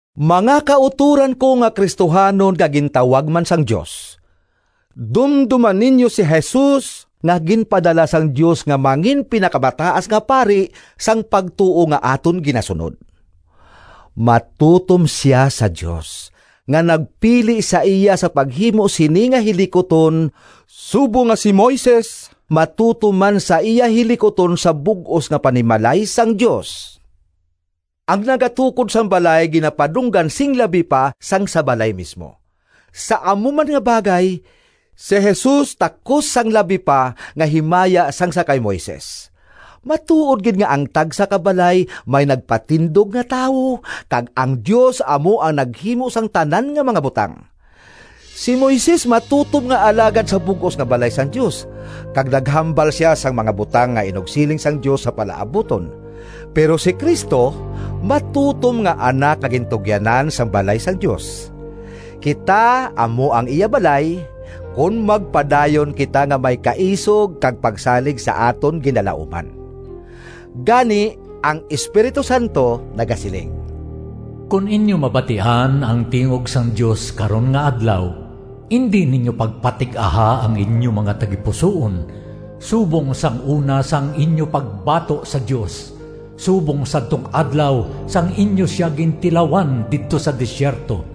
Mga kautoran ko nga Cristohanon nga gintawag man sang Dios! Dumdoma ninyo si Jesus, nga ginpadala sang Dios nga mangin-Pinakamataas nga Pari sang pagtuo nga aton ginasunod. Matutom sia sa Dios, nga nagpili sa iya sa paghimo sini nga hilikuton, subong nga si Moises matutom man sa iya hilikuton sa bug-os nga panimalay sang Dios. Ang nagatukod sang balay ginapadunggan sing labi pa sang sa balay mismo. Sa amo man nga bagay, si Jesus takos sang labi pa nga himaya sang sa kay Moises. Matuod gid nga ang tagsa ka balay may nagpatindog nga tawo—kag ang Dios amo ang naghimo sang tanan nga mga butang. Si Moises matutom nga alagad sa bug-os nga balay sang Dios, kag naghambal sia sang mga butang nga inugsiling sang Dios sa palaabuton. Pero si Cristo matutom nga Anak nga gintugyanan sang balay sang Dios. Kita amo ang iya balay, kon magpadayon kita nga may kaisog kag pagsalig sa aton ginalauman. Gani, ang Espiritu Santo nagasiling: “Kon inyo mabatian Ang tingog sang Dios karon nga adlaw, Indi ninyo pagpatig-aha Ang inyo mga tagipusoon Subong sang una Sang inyo pagbato sa Dios, Subong sadtong adlaw Sang inyo sia gintilawan Didto sa desierto.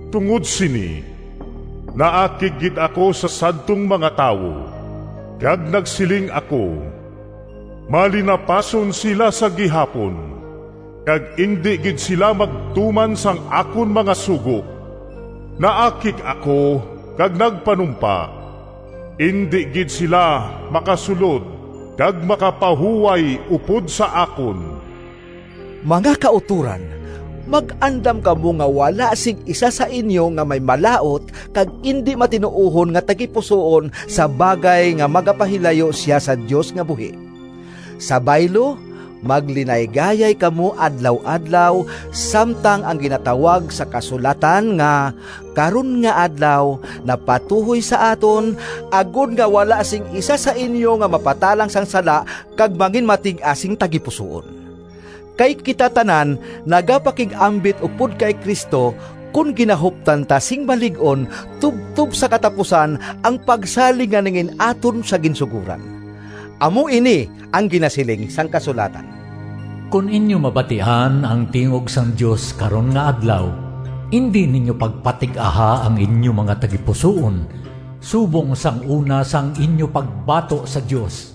Tungod sini, Naakig gid ako sa sadtong mga tawo, Kag nagsiling ako, ‘Malinapason sila sa gihapon, Kag indi gid sila magtuman Sang akon mga sugo.’ Naakig ako kag nagpanumpa: ‘Indi gid sila Makasulod kag makapahuway Upod sa akon!’” Mga kautoran, mag-andam kamo nga wala sing isa sa inyo nga may malaut kag indi matinuohon nga tagipusoon sa bagay nga magapahilayo sia sa Dios nga buhi. Sa baylo, maglinaygayay kamo adlaw-adlaw, samtang ang ginatawag sa kasulatan nga “Karon nga Adlaw” napatuhoy sa aton, agod nga wala sing isa sa inyo nga mapatalang sang sala kag manginmatig-a sing tagipusoon. Kay kita tanan nagapakig-ambit upod kay Cristo, kon ginahuptan ta sing malig-on tubtob sa katapusan ang pagsalig nga nangin-aton sa ginsugoran. Amo ini ang ginasiling sang kasulatan: “Kon inyo mabatian Ang tingog sang Dios karon nga adlaw, Indi ninyo pagpatig-aha Ang inyo mga tagipusoon Subong sang una Sang inyo pagbato sa Dios.”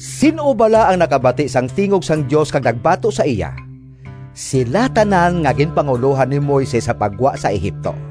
Sin-o bala ang nakabati sang tingog sang Dios kag nagbato sa iya? Sila tanan nga ginpangulohan ni Moises sa paggwa sa Egipto.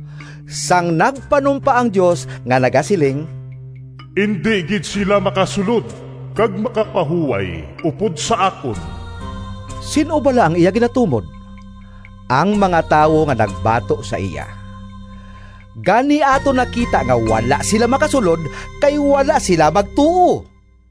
Sang nagpanumpa ang Dios nga nagasiling, “Indi gid sila makasulod kag makapahuway upod sa akon,” sin-o bala ang iya ginatumod? Ang mga tawo nga nagbato sa iya. Gani aton nakita nga wala sila makasulod, kay wala sila magtuo.